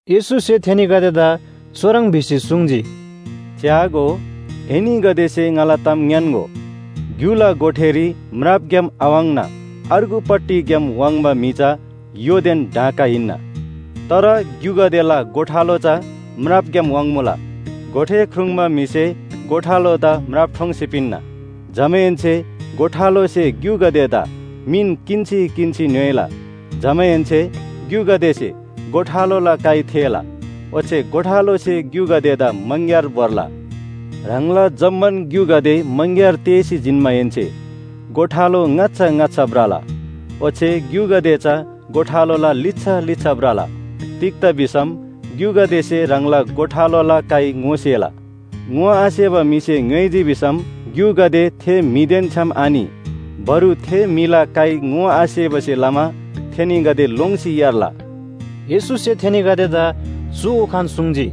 येशूसे थेनीगदेदा चुह्रङ् भिसी सुङ्जी, “च्‍यागो, एनीगदेसे ङाला ताम ङ्‌यान्‍गो, ग्‍युला गोठेरी म्रापग्‍याम आवाङ्ना अर्गुपट्टिग्‍याम वाङ्बा म्‍हि चा य्‍होदेन डाँका हिन्‍ना। तर ग्‍युगदेला गोठालो चा म्रापग्‍याम वाङ्मुला। गोठे ख्रुङ्बा म्‍हिसे गोठालोदा म्राप ठोङ्सी पिन्‍ना। जमाहेन्‍से गोठालोसे ग्‍युगदेदा मिन किन्‍सी किन्‍सी ङ्‌योइला। जमाहेन्‍से ग्‍युगदेसे गोठालोला काइ थेःला, ओच्‍छे गोठालोसे ग्‍युगदेदा मङग्‍यार भोर्ला। ह्राङला जम्‍मान ग्‍युगदे मङग्‍यार तेःसी जिन्‍माहेन्‍से गोठालो ङाच्‍छा ङाच्‍छा भ्रला, ओच्‍छे ग्‍युगदे चा गोठालोला लिच्‍छा लिच्‍छा भ्रला। तिग्‍दा भिसम ग्‍युगदेसे ह्राङला गोठालोला काइ ङोसेला। ङोआसेबा म्‍हिसे ङ्‌योइजी भिसम ग्‍युगदे थे म्‍हिदेन छ्‌याम आनि। बरु थे म्‍हिला काइ ङोआसेबासे लमा थेनीगदे लोङ्सी यार्ला।” येशूसे थेनीगदेदा चु उखान सुङ्जी।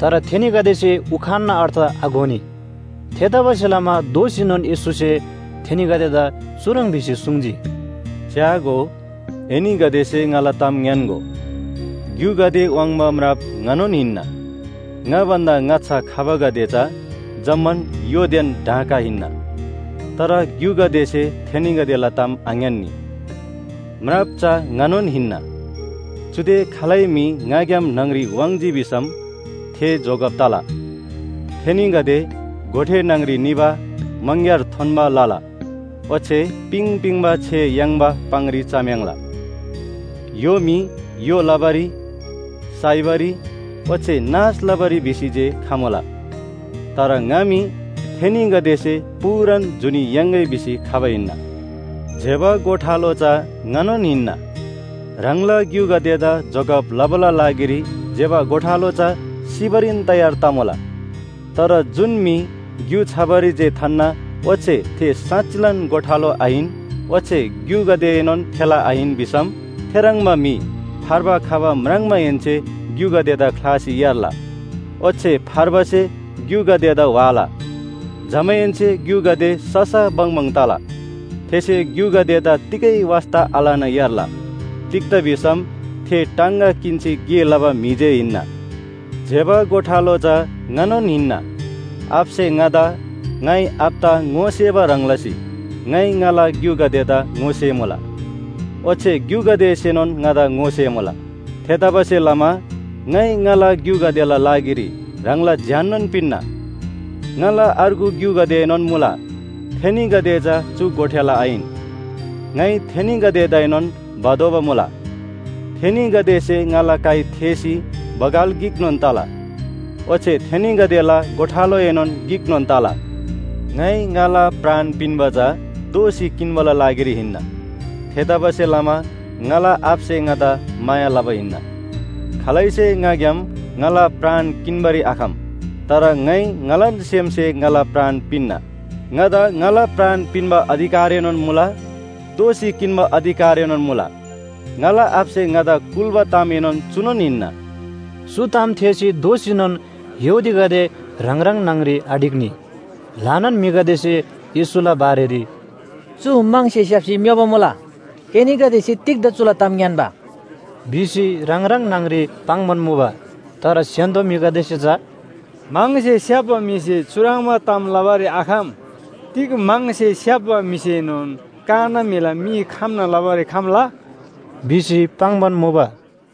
तर थेनीगदेसे उखानना अर्थ आघोनी। थेतबासेलमा दोःसीनोन येशूसे थेनीगदेदा चुह्रङ् भिसी सुङ्जी, “च्‍यागो, एनीगदेसे ङाला ताम ङ्‌यान्‍गो, ग्‍युगदे वाङ्बा म्राप ङानोन हिन्‍ना। ङा भन्‍दा ङाच्‍छा खबागदे चा जम्‍मान य्‍होदेन डाँका हिन्‍ना, तर ग्‍युगदेसे थेनीगदेला ताम आङ्‌यान्‍नी। म्राप चा ङानोन हिन्‍ना, चुदे खालै म्‍हि ङाग्‍याम न्‍हङ‍री वाङ्‌जी भिसम थे जोगब तला। थेनीगदे गोठे न्‍हङ‍री निबा मङग्‍यार थोन्‍बा लला, ओच्‍छे पिङ पिङबा छे याङ्बा पाङरी चम्‍याङ्ला। “य्‍हो मी य्‍हो लबारी, साइबारी ओच्‍छे नाश लबारी भिसी जे खमुला। तर ङा मी थेनीगदेसे पूरान जुनी याङ्‌गै भिसी खबा हिन्‍ना। ज्‍यबा गोठालो चा ङानोन हिन्‍ना। ह्राङला ग्‍युगदेदा जोगब लबाला लागिरी ज्‍यबा गोठालो चा सिबारीन तयार तमुला। तर जुन म्‍हि ग्‍यु छबारी जे थान्‍ना ओच्‍छे थे साँच्‍चिलान गोठालो आहिन ओच्‍छे ग्‍युगदेएनोन थेला आहिन भिसम थेह्रङ्बा म्‍हि फार्बा खबा म्राङ्माहेन्‍से ग्‍युगदेदा ख्‍लासी यार्ला। ओच्‍छे फार्बासे ग्‍युगदेदा व्‍हाला, जमाहेन्‍से ग्‍युगदे ससा बङबङ तला। थेसे ग्‍युगदेदा तिगै वास्‍ता आलना यार्ला। तिग्‍दा भिसम थे टाङगा किन्‍सी गे लबा म्‍हि जे हिन्‍ना। “ज्‍यबा गोठालो चा ङानोन हिन्‍ना। आबासे ङादा, ङाइ आबादा ङोसेबा ह्रङ् लसी ङाइ ङाला ग्‍युगदेदा ङोसेमुला, ओच्‍छे ग्‍युगदेसेनोन ङादा ङोसेमुला। थेतबासेलमा ङाइ ङाला ग्‍युगदेला लागिरी ह्राङला ज्‍याननोन पिन्‍ना। ङाला अर्गु ग्‍युगदेएनोन मुला, थेनीगदे चा चु गोठेला आहिन। ङाइ थेनीगदेदाएनोन भतोःबा मुला, थेनीगदेसे ङाला काइ थेःसी बगाल गिकनोन तला। ओच्‍छे थेनीगदेला गोठालोएनोन गिकनोन तला। “ङाइ ङाला प्राण पिन्‍बा चा दोःसी किन्‍बाला लागिरी हिन्‍ना। थेतबासेलमा ङाला आबासे ङादा माया लबा हिन्‍ना। खालैसे ङाग्‍याम ङाला प्राण किन्‍बारी आखम, तर ङाइ ङालान सेमसे ङाला प्राण पिन्‍ना। ङादा ङाला प्राण पिन्‍बा अधिकारएनोन मुला, दोःसी किन्‍बा अधिकारएनोन मुला। ङाला आबासे ङादा कुल्‍बा तामएनोन चुनोन हिन्‍ना।” चु ताम थेःसी दोःसीनोन यहूदीगदे ह्राङ ह्राङ न्‍हङ‍री आढिक्‍नी। ल्‍हानान म्‍हिगदेसे येशूला बारेरी, “चु म्‍हङसे स्‍याप्‍सी म्‍योबा मुला। एनीगदेसे तिग्‍दा चुला ताम ङ्‌यान्‍बा?” भिसी ह्राङ ह्राङ न्‍हङ‍री पाङ्‌बान मुबा। तर स्‍य्‍हान्‍दो म्‍हिगदेसे चा “म्‍हङसे स्‍याप्‍बा म्‍हिसे चुह्रङ्बा ताम लबारी आखम! तिग म्‍हङसे स्‍याप्‍बा म्‍हिसेनोन काना म्‍हिला मी खम्‍ना लबारी खम्‍ला?” भिसी पाङ्‌बान मुबा।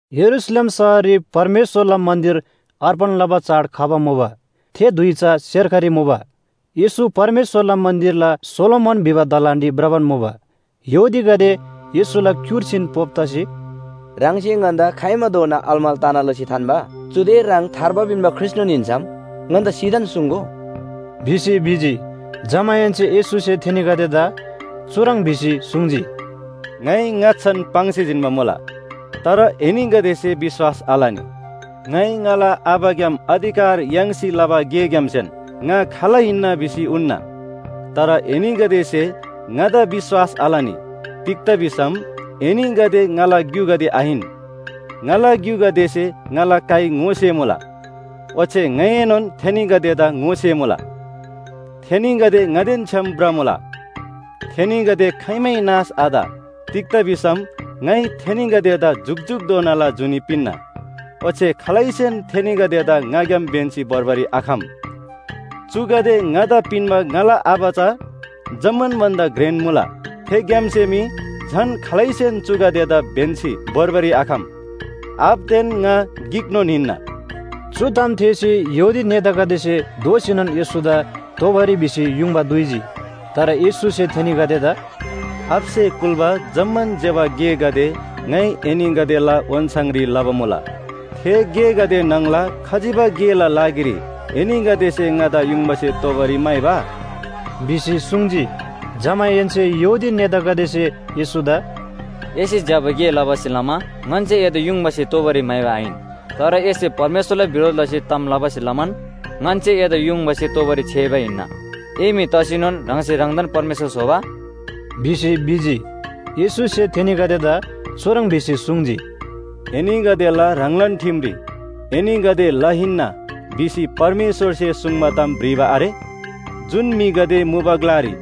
यरूशलेम शहररी परमेश्‍वरला मन्‍दिर अर्पण लबा चाड खबा मुबा। थे धुइ चा सेर्खरी मुबा। येशू परमेश्‍वरला मन्‍दिरला सोलोमन भिबा दलानरी भ्रबान मुबा। यहूदीगदे येशूला क्‍युर्सीन पोप तसी, “ह्राङसे ङन्‍दा खाइमाधोना अलमल तना लसी थान्‍बा? चुदे ह्राङ थार्बा पिन्‍बा ख्रीष्‍टनोन हिन्‍सम ङन्‍दा सिधान सुङ्‍गो” भिसी भिजी। जमाहेन्‍से येशूसे थेनीगदेदा चुह्रङ् भिसी सुङ्जी, “ङाइ ङाच्‍छान पाङ्सी जिन्‍बा मुला, तर एनीगदेसे विश्‍वास आलनी। ङाइ ङाला आबाग्‍याम अधिकार याङ्सी लबा गेग्‍यामसेन ङा खाल हिन्‍ना भिसी उन्‍ना। तर एनीगदेसे ङादा विश्‍वास आलनी, तिग्‍दा भिसम एनीगदे ङाला ग्‍युगदे आहिन। ङाला ग्‍युगदेसे ङाला काइ ङोसेमुला, ओच्‍छे ङाइएनोन थेनीगदेदा ङोसेमुला। थेनीगदे ङादेन छ्‌याम भ्रमुला। थेनीगदे खाइमै नाश आत। तिग्‍दा भिसम ङाइ थेनीगदेदा जुकजुकधोनाला जुनी पिन्‍ना। ओच्‍छे खालैसेन थेनीगदेदा ङाग्‍याम ब्‍यन्‍सी भोर्बारी आखम। चुगदे ङादा पिन्‍बा ङाला आबा चा जम्‍मान भन्‍दा घ्रेन मुला। थेग्‍यामसे मी झन खालैसेन चुगदेदा ब्‍यन्‍सी भोर्बारी आखम। आबादेन ङा गिकनोन हिन्‍ना।” चु ताम थेःसी यहूदी नेतागदेसे दोःसीनोन येशूदा तोबारी भिसी युङबा दुइजी। तर येशूसे थेनीगदेदा “आबासे कुल्‍बा जम्‍मान ज्‍यबा गेगदे ङाइ एनीगदेला ओन्‍छाङरी लबा मुला। थे गेगदे न्‍हङला खजिबा गेला लागिरी एनीगदेसे ङादा युङबासे तोबारी म्‍हाइबा?” भिसी सुङ्जी। जमाहेन्‍से यहूदी नेतागदेसे येशूदा “एसे ज्‍यबा गे लबासे लमा ङन्‍से एदा युङबासे तोबारी म्‍हाइबा आहिन। तर एसे परमेश्‍वरला बिरोध लसी ताम लबासे लमान ङन्‍से एदा युङबासे तोबारी छ्‌याइबा हिन्‍ना। ए म्‍हि तसीनोन ह्राङसे ह्राङदान परमेश्‍वर स्‍होबा?” भिसी भिजी। येशूसे थेनीगदेदा चुह्रङ् भिसी सुङ्जी, “एनीगदेला ह्राङलान ठिमरी ‘एनीगदे ल हिन्‍ना’ भिसी परमेश्‍वरसे सुङ्बा ताम भ्रिबा आरे? जुन म्‍हिगदे मुबा ग्‍लारी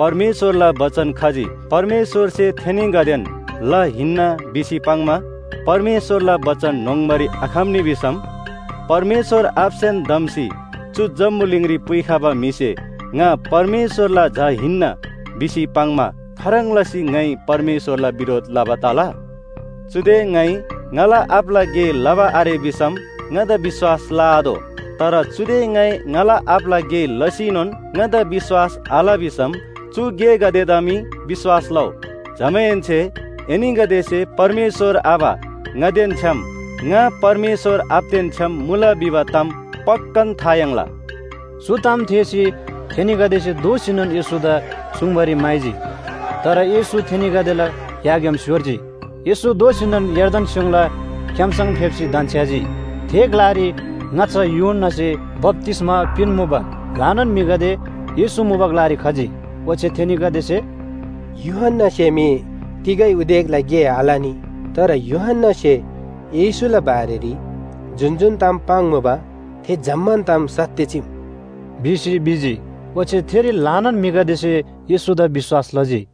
परमेश्‍वरला बचन खजी परमेश्‍वरसे थेनीगदेन ल हिन्‍ना भिसी पाङ्‌मा परमेश्‍वरला बचन न्‍होङ्बारी आखम्‍नी भिसम, परमेश्‍वर आबासेन धम्‍सी चु जम्‍बुलिङरी पुइखबा म्‍हिसे ‘ङा परमेश्‍वरला झा हिन्‍ना’ भिसी पाङ्‌मा खाह्रङ् लसी ङाइ परमेश्‍वरला बिरोध लबा तला? चुदे ङाइ ङाला आबाला गे लबा आरे भिसम ङादा विश्‍वास लआतोः। तर चुदे ङाइ ङाला आबाला गे लसीनोन ङादा विश्‍वास आल भिसम चु गेगदेदा मी विश्‍वास लउ। जमाहेन्‍से एनीगदेसे परमेश्‍वर आबा ङादेन छ्‌याम ङा परमेश्‍वर आबादेन छ्‌याम मुला भिबा ताम पक्‍कान था याङ्ला।” चु ताम थेःसी थेनीगदेसे दोःसीनोन येशूदा चुङ्बारी म्‍हाइजी। तर येशू थेनीगदेला याग्‍याम स्‍योर्जी। येशू दोःसीनोन यर्दन स्‍योङला क्‍याम्‍सङ फेप्‍सी धन्‍छ्‌याजी। थे ग्‍लारी ङाच्‍छा यूहन्‍नासे बप्‍तिस्‍मा पिन्‍मुबा। ल्‍हानान म्‍हिगदे येशू मुबा ग्‍लारी खजी। ओच्‍छे थेनीगदेसे, “यूहन्‍नासे मी तिगै उदेकला गे आलनी, तर यूहन्‍नासे येशूला बारेरी जुन जुन ताम पाङ्मुबा थे जम्‍मान ताम सत्‍य चीम” भिसी भिजी। ओच्‍छे थेरी ल्‍हानान म्‍हिगदेसे येशूदा विश्‍वास लजी।